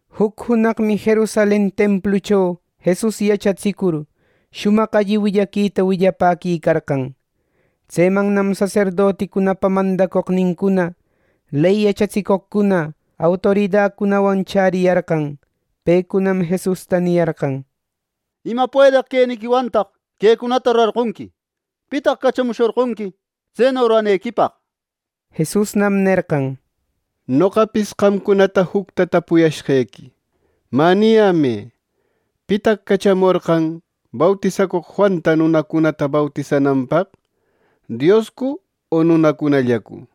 Juc junaqmi Jerusalen templucho Jesus yachatsicur, shumaq alli willaquita willapäquicarqan. Tsemannam saserdoticunapa mandacoqnincuna, ley yachatsicoqcuna, autoridacunawan chäriyarqan. Pecunam Jesusta niyarqan: —¿Ima puedeq queniquiwantaq quecunata rurarqonqui! ¿Pitaq cachamushorqonqui tseno ruranequipaq! —nir. Jesusnam nerqan: —Noqapis qamcunata jucta tapuyashqequi. Mä, niyämë: ¿Pitaq cachamorqan bautisacoq Juanta nunacunata bautisananpaq, Dioscu o nunacunallacu?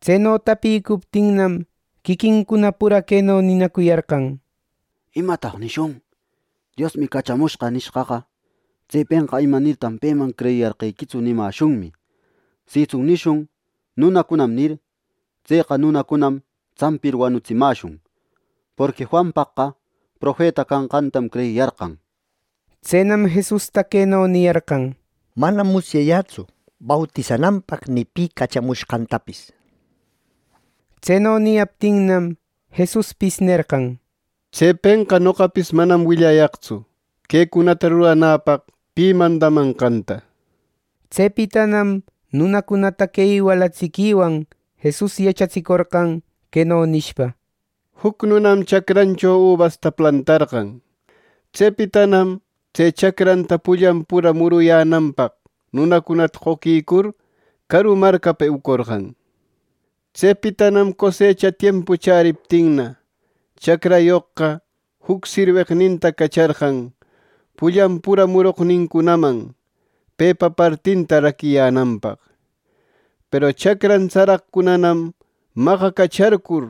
Tseno tapicuptinnam, quiquincuna pura queno ninacuyarqan: —¿Imataq nishun? ‘Diosmi cachamushqa’ nishqaqa, tsepenqa ‘¿Imanirtaq peman creyiyarqequitsu!’ nimäshunmi. Sitsun nishun ‘Nunacunam’ nir, tseqa nunacunanam tsampir wanutsimäshun, porqui Juanpaqqa profeta canqantam creyiyarqan —nir. Tsenam Jesusta queno niyarqan: —Manam musyayätsu bautisananpaq ni pi cachamushqantapis —nir. Tseno niyaptinnam, Jesuspis nerqan: —Tsepenqa noqapis manam willayaqtsu quecunata ruranäpaq pi mandamanqanta. Tsepitanam nunacunata que iwalatsiquiwan Jesus yachatsicorqan, queno nishpa: “Juc nunam chacrancho ubasta plantarqan. Tsepitanam tse chacranta pullan pura muruyänanpaq nunacunata qoquicur, caru marcapa eucorqan. Tsepitanam cosecha tiempu chäriptinna, chacrayoqqa juc sirweqninta cacharqan, pullan pura muroqnincunaman pepa partinta raquiyänanpaq. Peru chacran tsaraqcunanam maqacacharcur,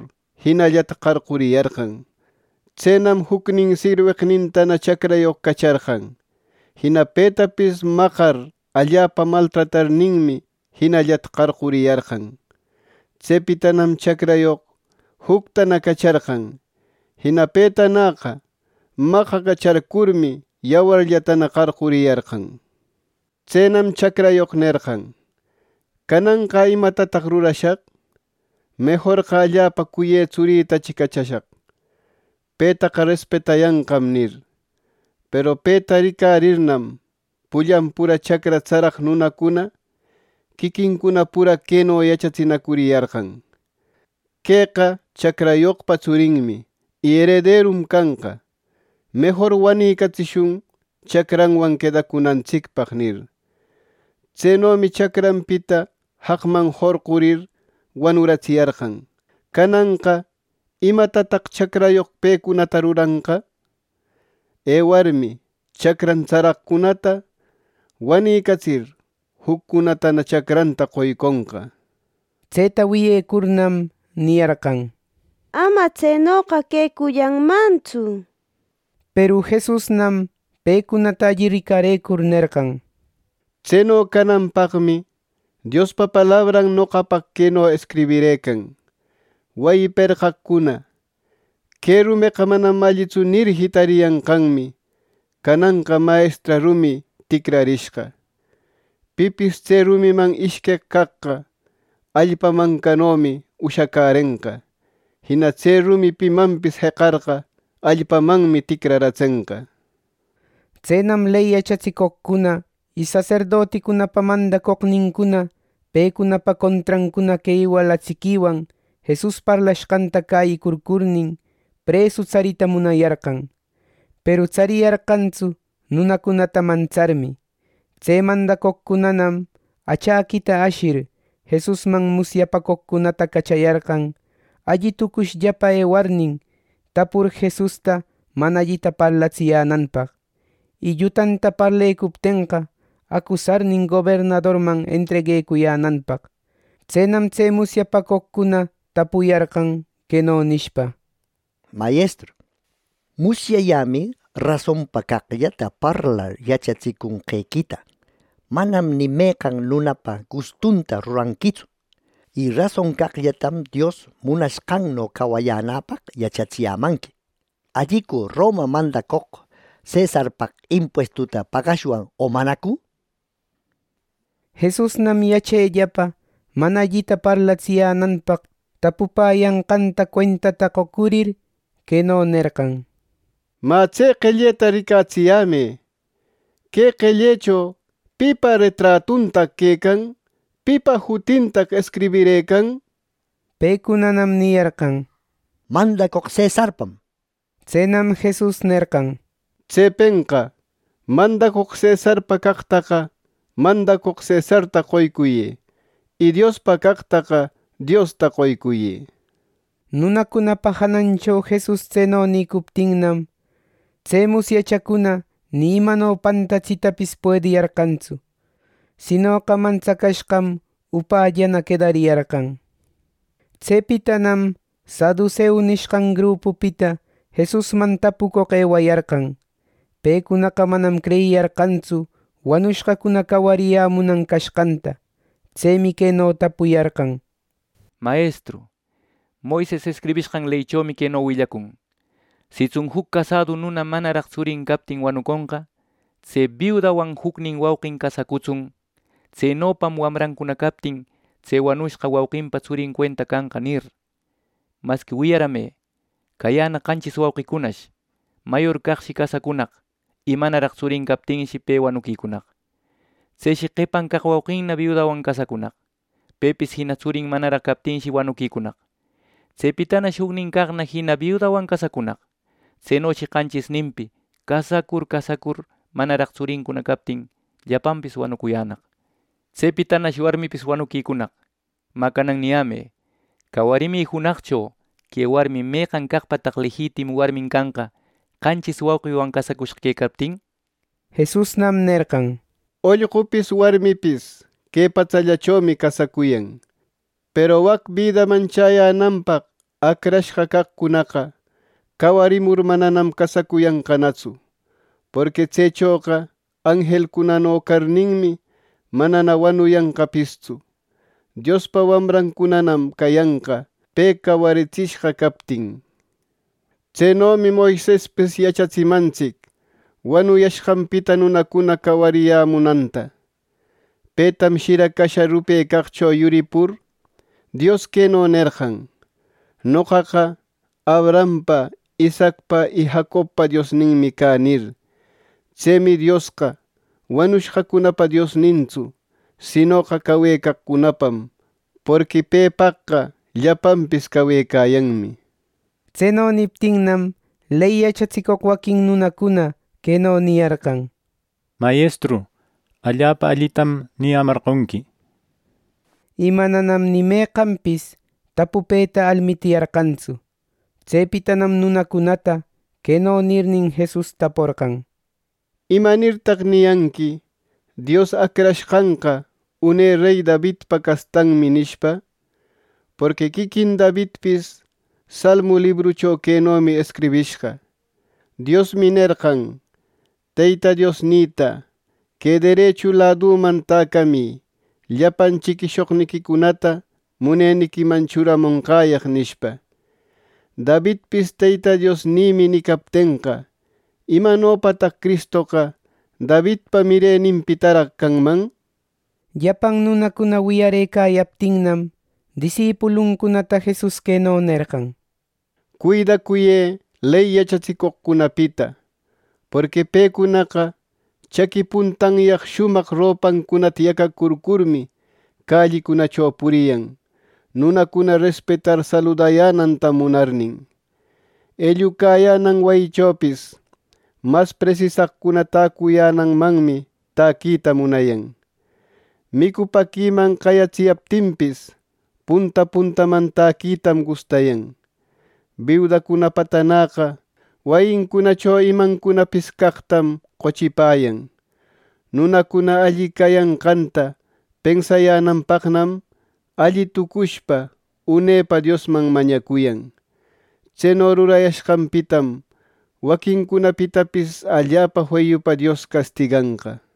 jinallata qarquriyarqan. Tsenam jucnin sirweqnintana chacrayoq cacharqan. Jina petapis maqar allapa maltratarninmi, jinallata qarquriyarqan. Tsepitanam chacrayoq juctana cacharqan. Jina petanäqa maqacacharcurmi, yawarllatana qarquriyarqan. “Tsenam chacrayoq nerqan, ‘Cananqa ¿imatataq rurashaq? Mejorqa allapa cuyë tsurïtachi cachashaq. Petaqa respetayanqam’ nir. Peru peta ricarirnam, pullan pura chacra tsaraq nunacuna quiquincuna pura queno yachatsinacuriyarqan: ‘Queqa chacrayoqpa tsurinmi y erederum canqa; mejor wanicatsishun chacranwan quedacunantsicpaq’ nir. Tsenomi chacranpita jaqman jorqurir wanuratsiyarqan. “Cananqa ¿imatataq chacrayoq pecunata ruranqa? Ewarmi, chacran tsaraqcunata wanicatsir, juccunatana chacranta qoyconqa” nir. Tseta wiyecurnam, niyarqan: —¡Ama tsenoqa quecullanmantsu! —nir. Peru Jesusnam pecunata alli ricarëcur nerqan: —Tseno cananpaqmi Diospa palabran noqapaq queno escribirëcan: ‘Wayi perqaqcuna: “Que rumeqa manam allitsu” nir, jitariyanqanmi, cananqa mayestra rumi ticrarishqa.’ Pipis tse rumiman ishqueq caqqa, allpa mancanomi ushacärenqa. Jina tse rumi pimanpis jeqarqa, allpamanmi ticraratsenqa. Tsenam ley yachatsicoqcuna y saserdoticunapa mandacoqnincuna pecunapa contrancuna que iwalatsiquiwan Jesus parlashqanta cäyicurcurnin, presu tsarïta munayarqan. Peru tsariyarqantsu, nunacunata mantsarmi. Tse mandacoqcunanam achäquita ashir, Jesusman musyapacoqcunata cachayarqan, alli tucushllapa ewarnin, tapur Jesusta mana allita parlatsiyänanpaq; y llutanta parlecuptenqa, acusarnin gobernadorman entreguecuyänanpaq. Tsenam tse musyapacoqcuna tapuyarqan, queno nishpa: —Mayestru, musyayämi rasonpa caqllata parlar yachatsicunqequita; manam ni meqan nunapa gustunta ruranquitsu. Y rason caqllatam Dios munashqanno cawayänäpaq yachatsiyämanqui. ¿Allicu Roma mandacoq cesarpaq impuestuta pagashwan o manacu? Jesusnam yachellapa mana allita parlatsiyänanpaq tapupäyanqanta cuentata qocurir queno nerqan: —Mä, tse qelleta ricatsiyämë. Que qellecho ¿pipa retratuntaq quecan? ¿Pipa jutintaq escribirëcan? Pecunanam niyarqan: —Mandacoq cesarpam —nir. Tsenam Jesus nerqan: —Tsepenqa mandacoq cesarpa caqtaqa mandacoq cesarta qoycuyë; y Diospa caqtaqa Diosta qoycuyë —nir. Nunacunapa janancho Jesus tseno nïcuptinnam, tse musyachacuna ni imano pantatsïtapis puediyarqantsu, sinoqa mantsacashqam upällana quedariyarqan. Tsepitanam saduseu nishqan grupupita Jesusman tapucoq ewayarqan. Pecunaqa manam creyiyarqantsu wanushqacuna cawariyämunan cashqanta. Tsemi queno tapuyarqan: —Mayestru, Moises escribishqan leychomi queno willacun: ‘Sitsun juc casadu nuna manaraq tsurin captin wanuconqa, tse biudanwan jucnin wauqin casacutsun. Tsenopam wamrancuna captin tse wanucushqa wauqinpa tsurin cuenta canqa’ nir. Masqui wiyarämë: Cayänaq qanchis wauqicunash. Mayor caqshi casacunaq, y manaraq tsurin captinshi pe wanuquicunaq. Tseshi qepan caq wauqinna biudawan casacunaq. Pepis jina tsurin manaraq captinshi, wanuquicunaq. Tsepitanash jucnin caqna jina biudawan casacunaq. Tsenoshi qanchisninpi casacur casacur, manaraq tsurincuna captin, llapanpis wanucuyänaq. Tsepitanash warmipis wanuquicunaq. Mä, canan niyämë: Cawarimi junaqcho que warmi ¿meqan caqpataq lejitimu warmin canqa, qanchis wauqiwan casacushqa quecaptin! —nir. Jesusnam nerqan: —Ollqupis warmipis que patsallachomi casacuyan. Peru wac bidaman chäyänanpaq acrashqa caqcunaqa cawarimur mananam casacuyanqanatsu. Porqui tsechoqa anjelcunano carninmi, manana wanuyanqapistsu. Diospa wamrancunanam cayanqa, pe cawaritsishqa captin. Tsenomi Moisespis yachatsimantsic wanuyashqanpita nunacuna cawariyämunanta. Petam shira casha rupecaqcho yuripur, Dios queno nerqan: ‘Noqaqa Abrahampa, Isaacpa y Jacobpa Diosninmi cä’ nir. Tsemi Diosqa wanushqacunapa Diosnintsu; sinoqa cawecaqcunapam, porqui pepaqqa llapanpis cawecayanmi. Tseno niptinnam, ley yachatsicoq waquin nunacuna queno niyarqan: —Mayestru, ¡allapa allitam niyämarqonqui! —nir. Y mananam ni meqanpis tapupeta almitiyarqantsu. Tsepitanam nunacunatana queno nirnin, Jesus taporqan: —¿Imanirtan niyanqui, ‘Dios Acrashqanqa une rey Davidpa castanmi’ nishpa? Porqui quiquin Davidpis Salmu libruncho quenomi escribishqa: ‘Diosmi nerqan Teyta Diosnïta: Que derechu ladüman täcamï llapan chiquiyäshoqniquicunata muneniquiman churamonqäyaq’ nishpa. Davidpis ‘Teyta Diosnïmi’ nicaptenqa, ¿Imanopataq Cristoqa Davidpa mireninpitaraq canman! Llapan nunacuna wiyarëcayaptinnam, disipuluncunata Jesus queno nerqan: “Cuidacuyë ley yachatsicoqcunapita, porqui pecunaqa chaqui puntanyaq shumaq ropancunata yacacurcurmi, callicunacho puriyan, nunacuna respetar saludayänanta munarnin. Ellucayänan wayichopis mas presisaqcuna täcuyänanmanmi täquita munayan. Micupäquiman qayatsiyaptinpis, punta puntaman täquitam gustayan. Biudacunapatanäqa wayincunacho imancunapis caqtam qochipäyan. Nunacuna alli cayanqanta pensayänanpaqnam, alli tucushpa unepa Diosman mañacuyan. Tseno rurayanqanpitam waquincunapitapis allapa feyupa Dios castiganqa.”